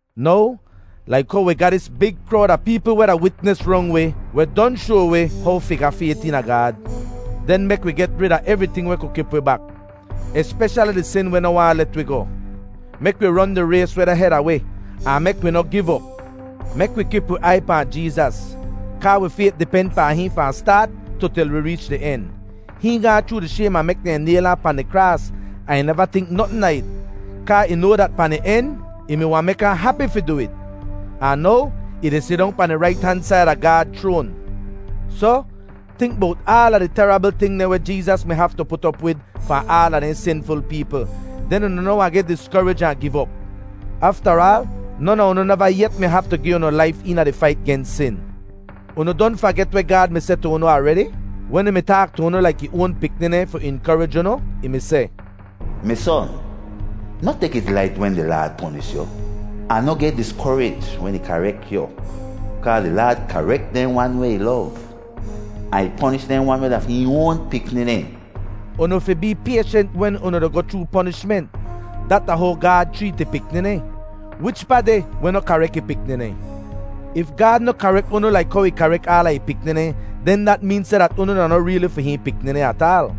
Now, laik how wi ga dis big krowd a peepl weh da witnis rong wi weh don shoa wi how fi ga fayt eena Gaad, den mek wi geh rid a evriting weh ku kip wi bak, espeshali di sin weh noh waahn let wi goh. Mek wi ron di rays weh deh heda wi, ahn mek wi noh giv op. Mek wi kip wi aiy pahn Jeezas, kaa wi fayt di pen pahn hihn fahn staat tu til wi reech di en. Hihn gaahn chroo di shaym a mek dehn nayl ahn pahn di kraas, ahn ih neva tink notn a it, kaa ih noa dat pahn di en ih mi wahn mek ahn hapi fi du it. Ahn now, ih di sidong pahn di rait han said a Gaad chroan. Soh, tink bowt aala di terabl ting dehn weh Jeezas mi haftu put op wid fahn aala dehn sinful peepl, den unu noh wahn geh diskorij ahn giv op. Aftaraal, non a unu neva yet mi haftu gi unu laif eena di fait gens sin. Unu don faget weh Gaad mi seh tu unu aredi, wen ih mi taak tu unu laik ih oan pikni dehn fi inkorij unu? Ih mi seh, “Mi son, noh tek it lait wen di Laad ponish yu, ahn noh geh diskorij wen ih karek yu. Kaa di Laad karek dehn wan weh ih lov, ahn ih ponish dehn wan weh da fi hihn oan pikni dehn.” Unu fi bee payshent wen unu di goh chroo ponishment. Dat da how Gaad chreet ih pikni dehn. Wich pa deh weh noh karek ih pikni dehn? If Gaad noh karek unu laik how ih karek aala ih pikni dehn, den dat meen seh dat unu da noh reeli fi hihn pikni dehn ataal.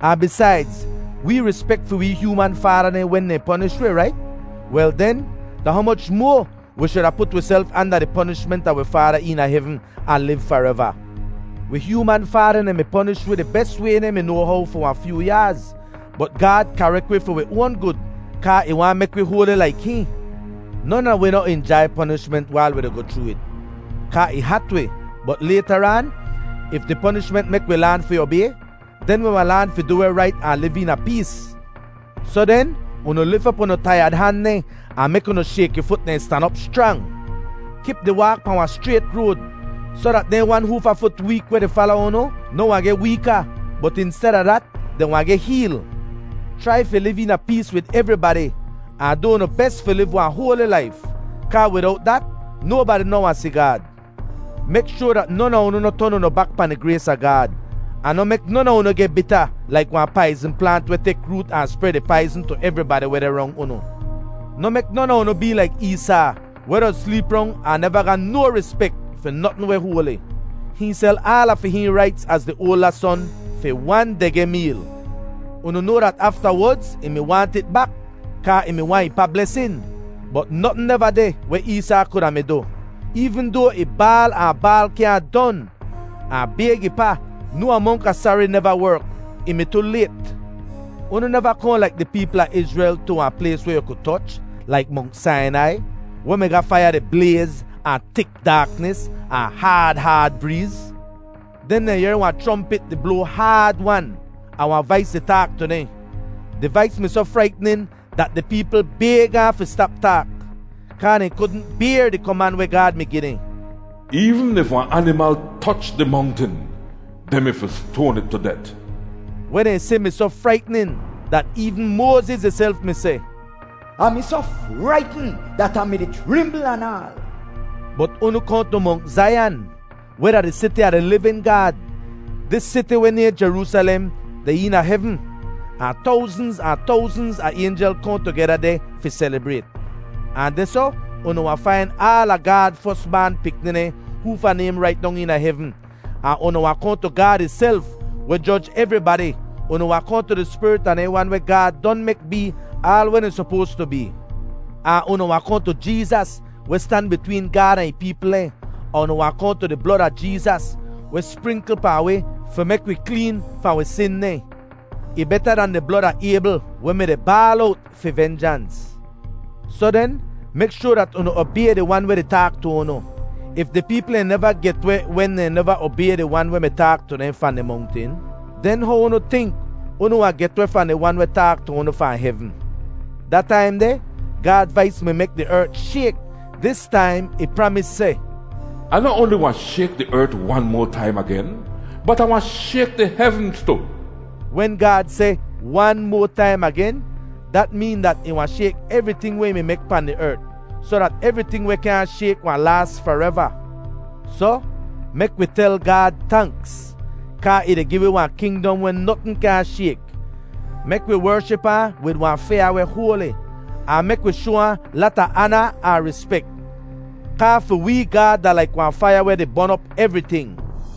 Ahn bisaidz, wee rispek fi wee hyooman faada dehn wen dehn ponish wi, rait? Wel den, da humoch moa wi shuda put wiself anda di ponishment a wi Faada eena hevn ahn liv fareva! Wi hyooman faada dehn mi ponish wi di bes way dehn mi noa how fi wahn fyoo yaaz, bot Gaad karek wi fi wi oan gud, kaa ih waahn mek wi hoali laik hihn. Non a wi noh injai ponishment wail wi di goh chroo it, kaa ih hat wi. Bot laytaraan, if di ponishment mek wi laan fi obay, den wi wahn laan fi du weh rait ahn liv eena pees. Soh den, unu lif op unu taiyad han dehn, ahn mek unu shayki fut dehn stan op schrang! “Kip di waak pahn wahn schrayt road,” soh dat dehn wan hoofa fut week weh di fala unu noh wahn geh weeka, bot insteda dat, dehn wahn geh heel. Chrai fi liv eena pees wid evribadi, ahn du unu bes fi liv wahn hoali laif, kaa widowt dat nobadi noh wahn si Gaad. Mek shoar dat non a unu noh ton unu bak pahn di grays a Gaad. Ahn noh mek non a unu geh bita laik wahn paizn plaant weh tek root ahn spred ih paizn tu evribadi weh deh rong unu. Noh mek non a unu bee laik Eesaa, weh doz sleep rong ahn neva ga no rispek fi notn weh hoali. Hihn sel aala fi hihn raits az di oalda son fi wan degeh meel. Unu noa dat aftawodz ih mi waahnt it bak kaa ih mi waahn ih pa blesin. Bot notn neva deh weh Eesaa kuda mi du, eevn doa ih baal ahn baal kyaahn don, ahn bayg ih pa. No amonk a sari neva werk. Ih mi tu layt. Unu neva kohn, laik di peepl a Izrel, tu wahn plays weh yu ku toch, laik Mongt Sainai, weh mi ga faiya di blayz, ahn tik daaknis, ahn haad haad breez. Den dehn yehr wahn chrompit di bloa haad-wan, ahn wahn vais di taak tu dehn. Di vais mi soh fraitnin dat di peepl bayg ahn fi stap taak, kaa dehn kudn bayr di koman weh Gaad mi gi dehn: “Eevn if wahn animal toch di mongtin, dehn mi fi stoan it tu det.” Weh dehn si mi soh fraitnin dat eevn Moaziz ihself mi seh, “Ah mi soh fraitn dat Ah mi-di chrimbl anaal.” Bot unu kohn tu Mongt Zaiyan, weh da di siti a di livin Gaad. Dis siti weh nayhn Jeroosalem deh eena hevn, ahn towznz ahn towznz a aynjel kohn tugeda deh fi selibrayt. Ahn dehsoh unu wahn fain aala Gaad fos baan pikni dehn hoofa naym rait dong eena hevn, ahn unu wahn kohn tu Gaad ihself, weh joj evribadi. Unu wahn kohn tu di spirit a dehn wan weh Gaad don mek bee aal weh dehn sopoas tu bee. Ahn unu wahn kohn tu Jeezas, weh stan bitween Gaad ahn ih peepl dehn. Ahn unu wahn kohn tu di blod a Jeezas, weh sprinkl pahn wi fi mek wi kleen fahn wi sin dehn. Ih beta dan di blod a Aybl weh mi-di baal owt fi venjans. Soh den, mek shoar dat unu obay di Wan weh di taak tu unu. If di peepl dehn neva get weh wen dehn neva obay di Wan weh mi taak tu dehn fahn di mongtin, den how unu tink unu wahn get weh fahn di Wan weh taak tu unu fahn hevn? Da taim deh, Gaad vais mi mek di ert shayk; dis taim ih pramis seh, “Ah noh oanli wahn shayk di ert wan moa taim agen, bot Ah wahn shayk di hevnz tu.” Wen Gaad seh, “Wan moa taim agen,” dat meen dat ih wahn shayk evriting weh ih mi mek pahn di ert, soh dat evriting weh kyaahn shayk wahn laas fareva. Soh, mek wi tel Gaad tanks, kaa ih di gi wi wahn kingdom weh notn kyaahn shayk. Mek wi wership ahn wid wahn fyaa weh hoali, ahn mek wi shoa ahn lata aana ahn rispek. Kaa fi wee “Gaad da laik wahn faiya weh di bon op evriting.”